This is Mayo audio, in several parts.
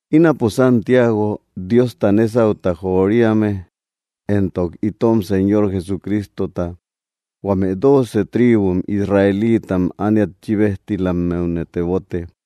Ínapo Santiago, Diosta nésauta joriame éntok itom Señor Jesucristota, huame dooce tribum Israelitam ániat chíbejtilammeune tebote.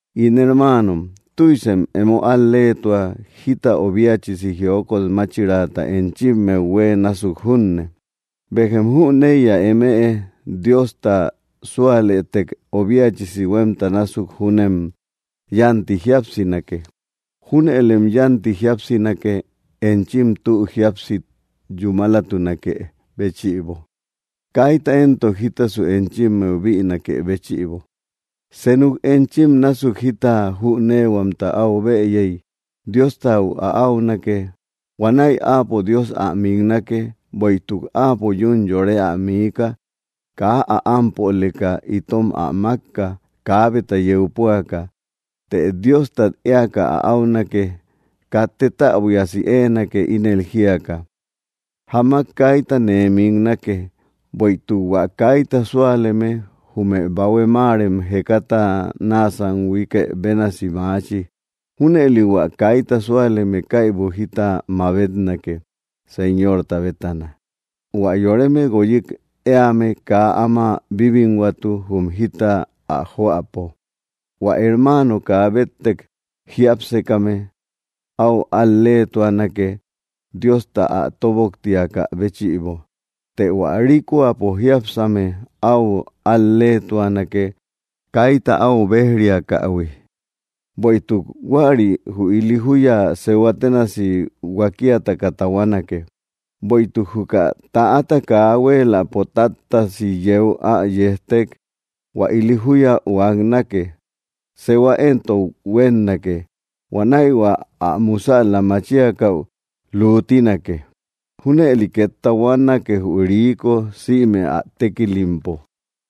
In hermaanom, tüisem emo al‑leetua jita obiachisi jiokot máchiraata enchimmeu huë násuk junne. Béjem jüneiya: Eme Diosta súalëtek obiachisi huémta násuk júnem yánti jíapsinake. Júnëlem yánti jíapsinake, enchim tü jíapsi yúmalatunakë béchïbo, kaita éntok jita enchimmeu bïnakë béchïbo. Senuk enchim násuk jita jüneehuamta áu bëyey, Diostau ä áunake. Huanäi Áapo Dios ä miknake. Bueïtuk Áapo yún yore ä miika; kaa ä ámpoleka itom ä mákka, kabeta yeu puaka. Të Diostat eaka ä áunake. Katë täbuiasi éenake, ínel jíaka: “Jamak kaita nee miknake.” Bueïtuk hua kaita súaleme jume bahue máarem jekata naasam huiikë bénasi maachi. Júnëli hua kaita súaleme kaibu jita mabetnake, Señorta bétana. Huä yoreme guoyik éame kaa áma bíbinhuatu, jum jita ä joäpo. Huä hermaano kaa béttek jiápsekame áu al-leetuanake, Diosta ä tóboktiakä béchïbo. Të hua rikoapo jiápsame áu al-leetuanake kaita áu béj‑riakähui; bueïtuk huäri jü ili júya sehua ténasi huakiataka tahuanake. Bueïtuk juka täata kaa huéeläpo táttasi yeu ä yejtek, hua ili júya huaknake; sehua éntok huénnake. Huanäi hua ä musäla machiakäu luutinake. Júnëli két tahuanake, jü riiko sïme ä tékilimpo.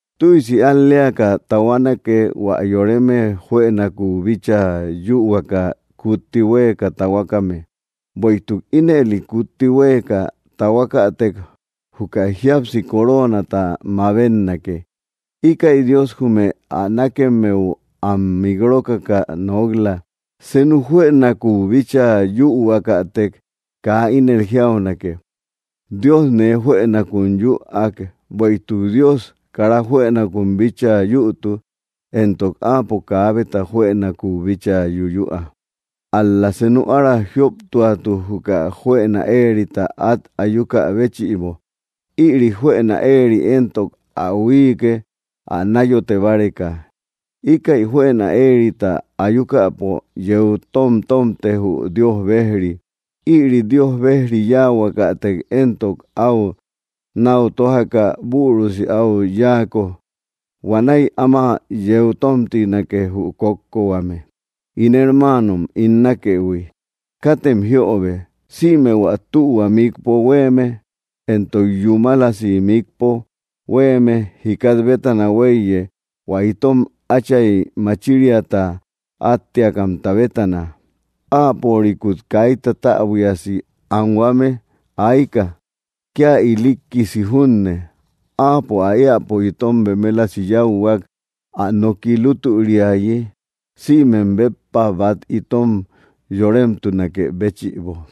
Tüisi al‑leaka tahuanake, hua yoreme juënakuú bíchaa yühuaka kutti huéeka tahuakame; bueïtuk ínëli kutti huéeka tahuakatek, juka jíapsi coroonata mabetnake. Íkäi Dios jume ä nákemmeu am mik rókaka nok‑la. Senu juënakuú bíchaa yühuakatek kaa ínel jiaunake: “Dios nee juënakun yüak”; bueïtuk Dios kara juënakuu bíchaa yütu, éntok Áapo kaabeta juënakuu bíchaa yuyüa. Ál‑la senu ára jioptuatu, juka juëna éerita at ayukä béchïbo. Ïri juëna éeri éntok ä huíike, ä náyote báreka. Íkäi juëna éerita ayukäpo yeu tomtomte, jü Dios bejri. Ïri Dios bejri yahuakatek éntok, áu náu tójaka bürusi áu yáako, huanäi áma yeu tomtinake, jü kókkohuame. In hermaanom ín nákëhui, katem jiöbe. Sïme hua tühua mikpo huéeme entok yúmalasi mikpo huéeme jikat bétana huéiye, hua itom Áchay machiriata átteakamta bétana. Áapörikut kaita täbuiasi anhuame ayka, kía ilikkisi junne. Áapo ä éäpo itom bemelasi yáuhuak, ä noki lútüriayi, sïmem béppa bát itom yoremtunakë béchïbo.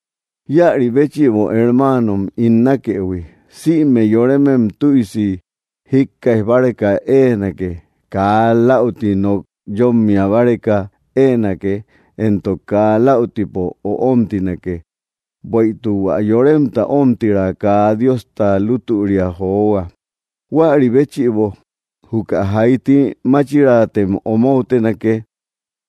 Íäri béchïbo, hermaanom ín nákëhui, sïme yoremem tüisi jíkkaij báreka éenake, kaa läuti nok yómmia báreka éenake, éntok kaa läutipo öomtinake. Bueïtuk hua yoremta ómtira kaa Diosta lútüria johua. Huäri béchïbo, juka jaiti máchiraatem omoutenake,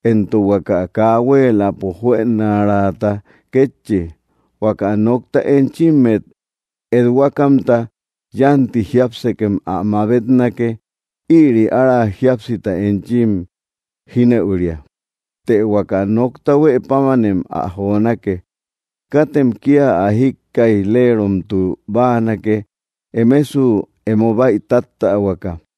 éntok huaka kaa huéeläpo juënaraata kétchi. Huaka nokta enchimmet ethuakamta, yánti jiápsekem ä mabetnake. Ïri ára jíapsita enchim jínëuria. Të huaka nokta huë pámanem ä jonake. Katem kía ä jíkkaij‑leromtu báanake, emesu emo bäitattähuaka.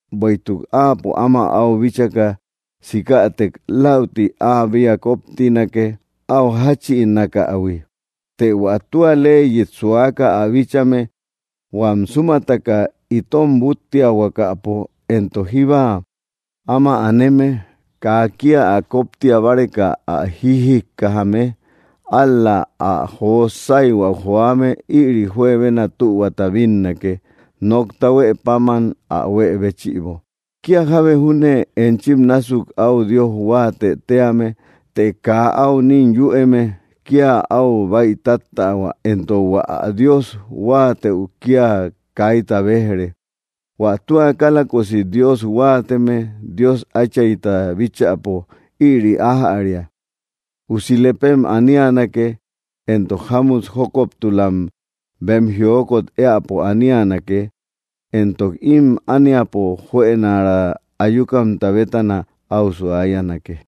Bueïtuk áapo áma áu bíchaka sikätek, läuti áa bea kóptinake áu jáchïnakähui. Të hua tua leyit suaka ä bíchame, huam súmataka itom búttiahuakapo, éntok jíba áma aneme, kaa kía ä kóptia báreka ä jijikkajame, ál‑la ä jo sáyhuäu joame, ïri juebena tühuata bínnake, nokta huë páman ä huë béchïbo. Kía jábe júne enchim násuk áu Dios huáatë tíame, të kaa áu nín yüeme, kía áu bäitattähua, éntok hua ä Dios huáatëu kía kaita béj‑re. Huä tua kálakosi Dios huáateme, Dios Áchayta bíchäpo, ïri ájäria: usi lepem anianake, éntok jámut jókoptulam bem jiokot éäpo anianake, éntok ím ániapo juënaraa ayukamta bétana áu suayanake.